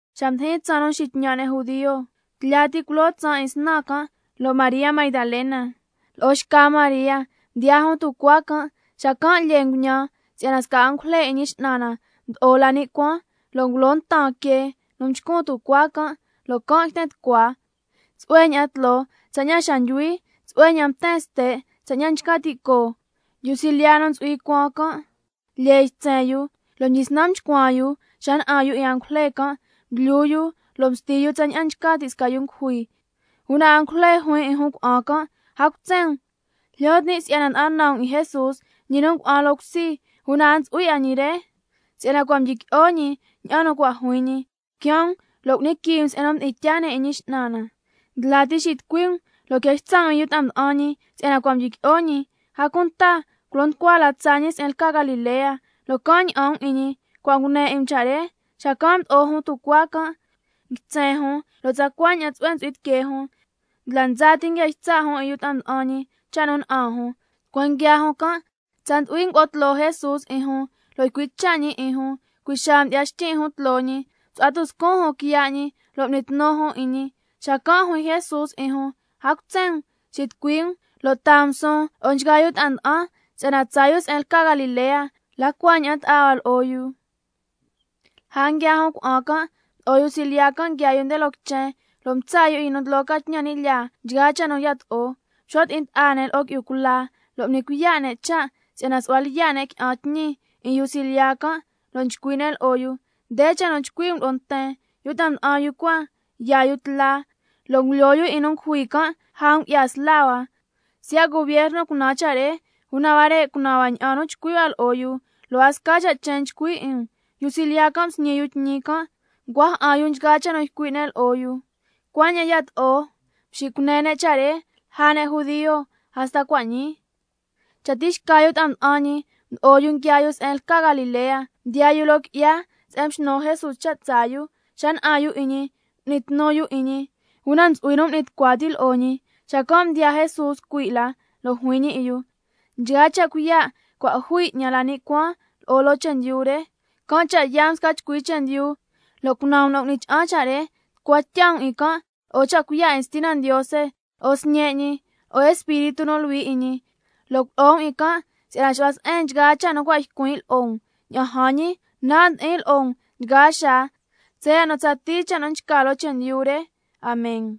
Xa mdijin tsaan nu nxitñan' ne' judio, tlya ti culoo tsaan 'in snan can', lo' María Magdalena lo'o xca María mdiyaa jun tucuaa can'. Xacan' lyee nguñan si'yana sca angujle 'in Ñi X'nan na mdo'o la ni' cuaan, lo' ngulo ntan quee nu nchcun tucuaa can', lo' can' yten tucua. Tsu'hue ña'an tloo tsaña'an nchca ti' xa ndyuhui, tsu'hue ña'an mten ste' tsaña'an nchca ti' coo. Yu nu ntsu'hui cuan can' lyee ytsen yu, lo' mdyisnan mchcuan yu xa na'an yu 'in angujle can', mdlyu yu lo' msti yu tsaña'an nchca ti' sca yu ngujui. Una angujle juin 'in jun cuna'an can': A cutsen um, jlyo tin' si'yana nda'an nan um 'in Jesús, ñi nu ngua'an loo cusi, una a ntsu'hui 'a ñi re, si'yana cua' mdyiqui'o ñi ña'an nu cua' juin ñi. Quiaan um lo' cu'ni quii um se'en nu mdi'in tyaa ne' 'in Ñi X'nan na. Ndla ti xitucui um lo' quia ytsa' um 'in yu ta'a mda'an ñi si'yana cua' mdyiqui'o ñi, a cunta culo nducua la tsaa ñi se'en lca Galilea, lo' can' ña'an um 'in ñi. Cua' ñii ngune 'in um cha' re. Xacan' mdo'o jun tucuaa can', nguitsen jun lo' tsacua ña'an tsu'hue ntsu'hui tiquee jun, ndla ndsa ti nguia ytsa' jun 'in yu ta'a mda'an ñi cha' nu na'an jun. Tucueen nguiaa jun can' tsa ndu'hui ngulo'o tloo Jesús 'in jun, lo' ycui' cha' ñi 'in jun, cui' xaa mdyi'ya xtyin' jun tloo ñi, msu'hua tuscun jun quiya' ñi, lo' m'ni tnu jun 'in ñi. Xacan' juin Jesús 'in jun: A cutsen um, xitucui um lo' taa um suun lo'o nchgaa yu ta'an si'yana tsaa yu se'en lca Galilea, la cua ña'an ta'a hua lo'o yu. Lja nguiaa jun cuna'an can', mdo'o yu silyiya can' nguiaa yu nde loo quichen, lo' mtsa' yu 'in yu nu ndlo ca tñan ni' lyaa nchgaa cha' nu yato'o. Mxo' ti'in ta'a ne' lo'o qui'yu cula, lo' m'ni cuiya' ne' cha' si'yana su'hua lyiya' ne' qui'an tñi 'in yu silyiya can', lo' nchcui' ne' lo'o yu: Nde cha' nu chcui' um lo'o nten: Yu ta'a mda'an yu cua, yaa yu tla lo' ngulyoo yu 'in nu ngujui can' lja ngu'ya sla hua. Siya' gubierno cunan cha' re, una huare' cunan hua ña'an nu chcui' hua lo'o yu, lo' a sca cha' chen nchcui 'in um. Yu silyiya can' msñi yu tñi can', ncua ja'an yu nchgaa cha' nu ycui' ne' lo'o yu, cuaña'an yato'o mxicune ne' cha' re lja ne' judio hasta cua' ñii. Cha tixca yu ta'a mda'an ñi mdo'o yu nguiaa yu se'en lca Galilea, mdiyaa yu loo qui'ya se'en mxnu Jesús cha' tsaa yu. Xa na'an yu 'in ñi m'ni tnu yu 'in ñi, una ntsu'hui nu m'ni tucua ti' lo'o ñi. Xacan' mdiyaa Jesús cui' la can', lo' juin ñi 'in yu: Nchgaa cha' cuiya' cua' jui 'ñan la ni' cuaan lo'o loo chendyu re. Can' cha' yaa um sca chcui chendyu lo' cunan um nu cu'ni cha'an cha' re, tucua tya um 'in can' lo'o cha' cuiya' 'in Stina Ndiose, lo'o Sñe' ñi, lo'o Espíritu nu Luhui 'in ñi, lo' culo'o um 'in can' si'yana xu'hua se'en nchgaa cha' nu cua' ycuin' lo'o um. Ña'an jan ñi, nan' ndi'in lo'o um nchgaa xaa tsaya' nu tsatii cha' nu nchca loo chendyu re. Amen.